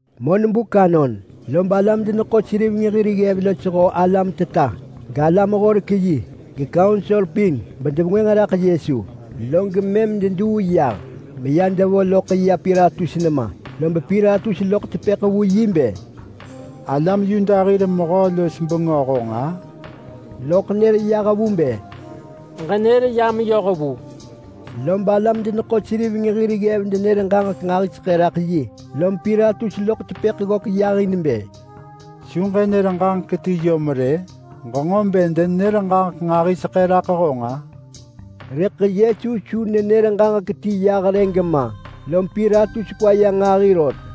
Monbuk anon lob alam-deneḳo-seriveng hir ggev losho alam teta, galam-horek-yi, gekaunsor pin bedevengwënġ raḳ Yesu, log mëm deduu yah meya devo loḳ ya Pilatus nema. Lob Pilatus loḳ tepëḳ vu yi bë, “Alam Yuda hir mehö-los-bengö honġ-a?” Loḳ nër yah vu bë, “Ġenër ya meyoh vu!” Lob alam-deneḳo-seriveng hir ggev denër ġaġek nġahiseḳë raḳ yi. Lom Pilatus loḳ tepëḳ ggök yahin bë, “Su ġënër ġaġek ti yom rë? Ġenġo bë denenër ġaġek nġahiseḳë raḳ honġ-a?” Rëḳ Yesu su nenër ġaġek ti yah rë gema, lom Pilatus kwa ya nġahi rot.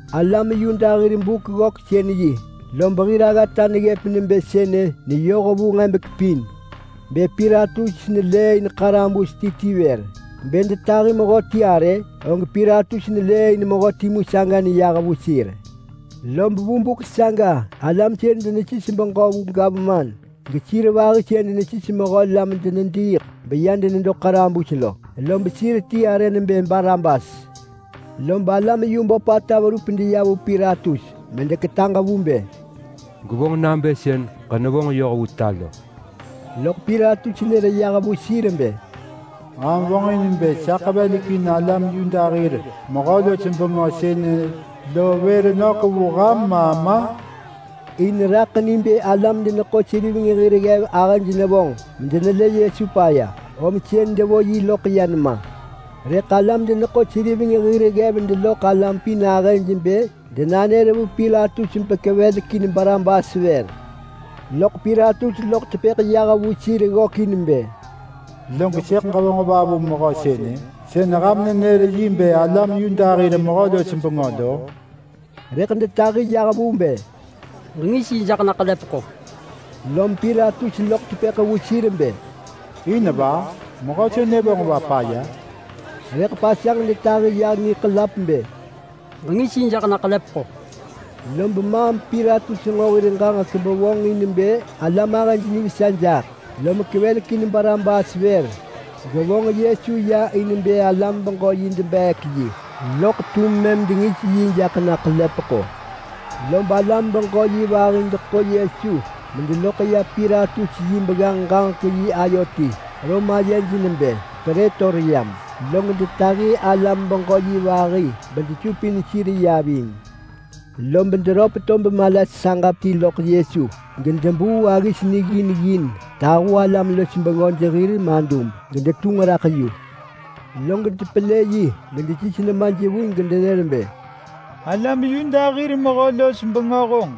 Alam Yuda hir Buk-ggöksën-yi lob hir aggata neggëp nebë sënë neyoh vu nġebek pin bë Pilatus nelëëin ḳarabus ti ti vër. Bë detahi mehöti arë, og Pilatus nelëëin mehö timu saga neyah vu sir. Lob vu buk saga alam sën denesis beġö vu gavman, gesir vahi sën denesis mehö la medenediiḳ beya denedo ḳarabus lo, lob sir ti arë nebë Barabas. Lob alam yu böpata verup deya vu Pilatus medeketaġ vu bë, “Gwevonġ nabë sën ġenevonġ yoh vu ta lo!” Loḳ Pilatus nër yah vu sir bë, “Ham vonġin bë sa ḳevelekin alam Yuda hir mehö-los-bengö sënë lo vër nök vu ham ma ma?” In raḳ ni bë alam-deneḳo-seriveng hir ggev ahëj nevonġ medenelë Yesu paya, om sën devo yi loḳ ya nema. Rëḳ alam-deneḳo-seriveng hir ggev deloḳ alam pin ahëj bë denanër vu Pilatus bekevelekin Barabas vër. Loḳ Pilatus loḳ tepëḳ yah vu sir ggökin bë, “Log sëḳ ġevonġ va vu mehö sënë, sën ham nenër yi bë alam Yuda hir mehö-los-bengö lo?” Rëḳ detahi yah vu bë, “Ġengis yi jaḳ na ḳelepeḳo!” Lom Pilatus loḳ tepëḳ vu sir bë, “In va? Mehö sënë vonġ va paya?” Rëḳ pasanġ detahi ya niḳelap bë, “Ġengis yi jaḳ na ḳelepeḳo!” Lob mëm Pilatus nġo hir ġaġek bevonġin bë alam ahëj nivesa jaḳ, lom kevelekin Barabas vër, gevonġ Yesu ya in bë alam-beġö-yi debeek yi, loḳ mëm dengis yi jaḳ na ḳelepeḳo. Lob alam-beġö-yi vahi deḳo Yesu medeloḳ ya Pilatus yi begganġ-ġaġek-yi ayo ti (Rom ayej nebë Prëtoryam), log detahi alam-beġö-yi vahi bedesupin sir ya ving. Lob deröp tob mala saġap ti loḳ Yesu gedebuu aggis niggin ggin tahu alam-los-bengöj hir madub gedetunġ raḳ yu. Log depelë yi gedesis nemaj vu gedenër bë, “Alam Yuda hir mehö-los-bengö honġ,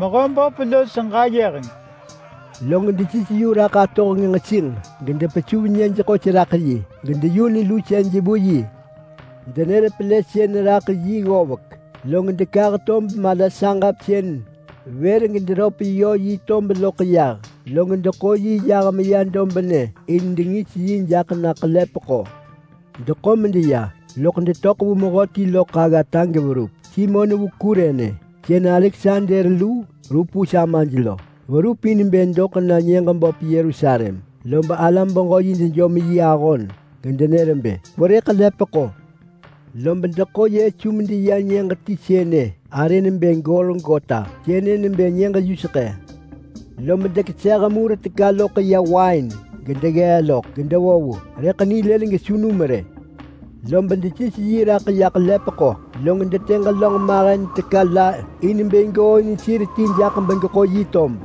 mehö böp los ġayeheng!” Log desis yu raḳ atohenġ nġesinġ gedepesuv nyëj ḳos raḳ yi gedeyun lusej vu yi. Denër pelësën raḳ yi ggovek, log dekah tob mala saġap sën vër gederöp yö yi tob loḳ yah, log deḳo yi yah meya dobnë in dengis yi jaḳ na ḳelepeḳo. Deḳo medeya lob detöḳ vu mehöti loḳ aggata geverup. Simon vu Kurene, sën Aleksander lu Rupus amaj lo, verup in bë doḳ na nyëġ böp Yerusalem, lob alam-beġö-yi dejom yi ahon gedenër bë, “Kwerë ḳelepeḳo!” Lob deḳo Yesu medeya nyëġ ti sënë arë nebë Golgota (sënë nebë Nyëġ-yuseḳë). Lob dekeseh mur teka loḳ ya wain medeggee loḳ gedevo vu, rëḳ nilëlin gesu num rë. Lob desis yi raḳ ya ḳelepeḳo, log detë ġelönġ mahen teka la in bë gooin sir ti ti jaḳ bedegeḳo yi tob.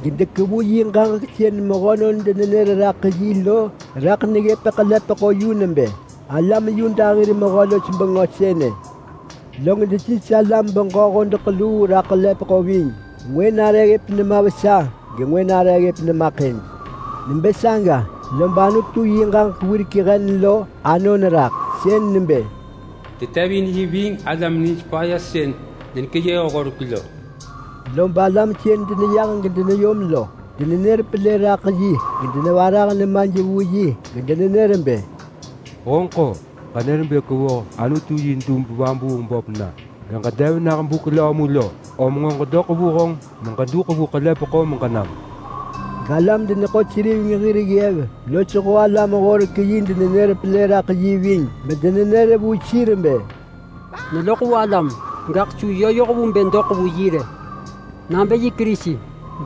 Gedekevu yi ġaġek sën mehönon denenër raḳ yi lo raḳ neggëp ḳelepeḳo yu nebë: ALAM YUDA HIR MEHÖ-LOS-BENGÖ SËNË! Log desis alam beġö hodeḳ luu raḳ ḳelepeḳo ving. Ngwë nare ggëp nema vesa gengwë nare ggëp nema ḳëj. [Nebë saga lob Anutu yi ġaġek wirek hen lo anon raḳ, sën nebë: “Detevin yi ving alam nij paya sën denekeyëh horek lo.”] Lob alam sën deneyah gedeneyom lo, denenër pelë raḳ yi gedenevarah nemaj vu yi gedenenër bë, “Honġeḳ-o! Ġenër bë kwevoh Anutu yi dub-vabuung-böp na, geġedev nah buk löö mu? Om nġo ġedoḳ vu honġ meġeduḳ vu ḳelepeḳo meġenam!” Galam-deneḳo-seriveng hir ggev losho alam-horek-yi denenër pelë raḳ yi ving bedenenër vu sir bë, “Neloḳ vu alam, gaḳ su yoh vu bë yö doḳ vu yi rë. Nabë yi Kerisi,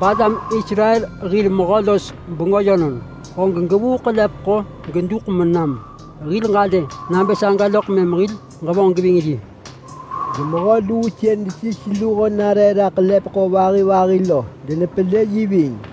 balam Israel hir mehö-los-bengö yönon, og gevuu ḳelepeḳo geduḳ menam. Hil ġalë nabë saga loḳ mëm hil ġevonġ geving yi!” Gemehö luu sën desis luho nare raḳ ḳelepeḳo vahi vahi lo denepelë yi ving.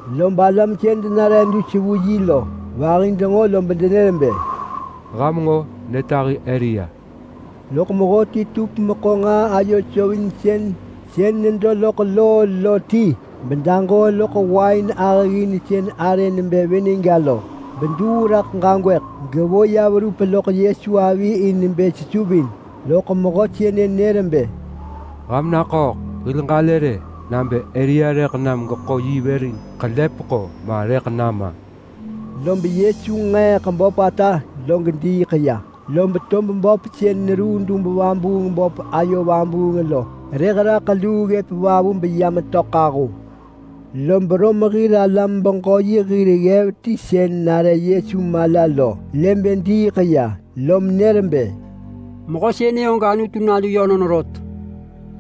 Lob alam sën denare dus vu yi lo vahi denġo lob denër bë, “Ham nġo! Netahi Elia!” Loḳ mehöti tup meḳo nġaa ayo sovinsën sën nedo loḳ loo lo ti bedaġoo loḳ wain ahëggin sën arë nebë vinegga lo, geduu raḳ ġagwëḳ gevo ya verup loḳ Yesu avi in bë sesuvin, loḳ mehö sënë nër bë, “Ham naḳööḳ! Hil ġalë rë nabë Elia rëḳ nam geḳo yi vër in ḳelepeḳo ma rëḳ nama!” Lob Yesu nġeeḳ böpata log diiḳ ya, lob tob böp sën neruu dub-vabuung-böp ayo vabuung lo kweeḳ raḳ luu ggëp vavu beya metöḳ ahu. Lob Rom hir alam-beġö-yi hir ggev ti sën nare Yesu mala lo lë bë diiḳ ya, lom nër bë, “Mehö sënë og Anutu Nalu yönon rot!”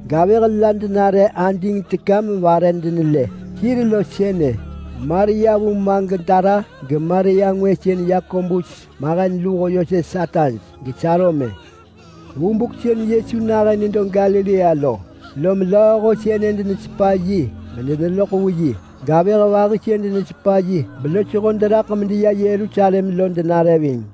Gavëh la denare ading teka mevare denelë. Sir lo sënë Maria vu Magdala, geMaria ngwë sën Yakobus mahen luho Yoses ataj, geSalome. Vu buk sën Yesu nahën nedo Galilea lo, lom lööho sënë denesepa yi medeneloḳ vu yi. Gavëh vahi sën denesepa yi belosho deraḳ medeya Yerusalem lo denare ving.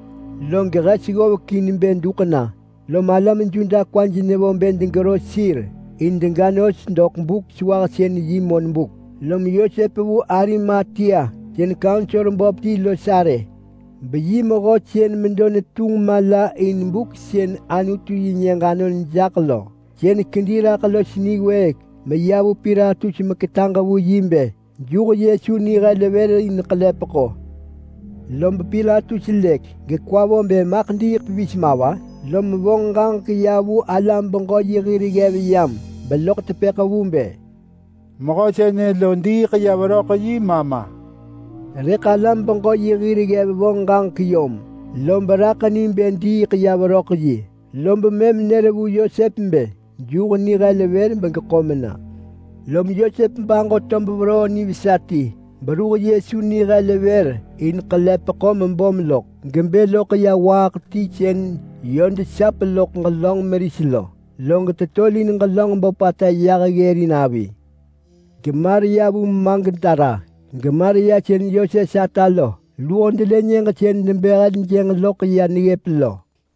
Log hes ggovek in bë duḳ na, lom alam Yuda kwaj nevo bë degero sir in dega nos doḳ Buk-sewahsën-yi monbuk. Lom Yosep vu Arimatea sën kaunsor böp ti los arë, beyi mehö sën medo netunġ mala in buk sën Anutu-yi-nyëġ anon jaḳ lo. Sën kedi raḳ los niwëëk meya vu Pilatus meketaġ vu yi bë juh Yesu nihel vër in ḳelepeḳo. Lob Pilatus lëk in, gekwa vo bë maḳ diiḳ pevis ma va? Lom vonġ ġaġek ya vu alam-beġö-yi hir ggev yam, beloḳ tepëḳ vu bë, “Mehö sënë lo diiḳ ya veröḳ yi ma ma?” Rëḳ alam-beġö-yi hir ggev vonġ ġaġek yom vu, lob raḳ ni bë diiḳ ya veröḳ yi, lob mëm nër vu Yosep bë juh heljënġ vër begeḳo mena. Lom Yosep baġo tob veroo nivesa ti, beruh Yesu nihel vër in ḳelepeḳo mebom loḳ, gebë loḳ ya waaḳ ti sën yö desap loḳ ġelönġ meris, log tetolin ġelönġ böpata yah ggërin avi. GeMaria vu Magdala, geMaria sën Yoses ata lo, luho delë nyëġ sën debë heljënġ loḳ ya neggëp lo.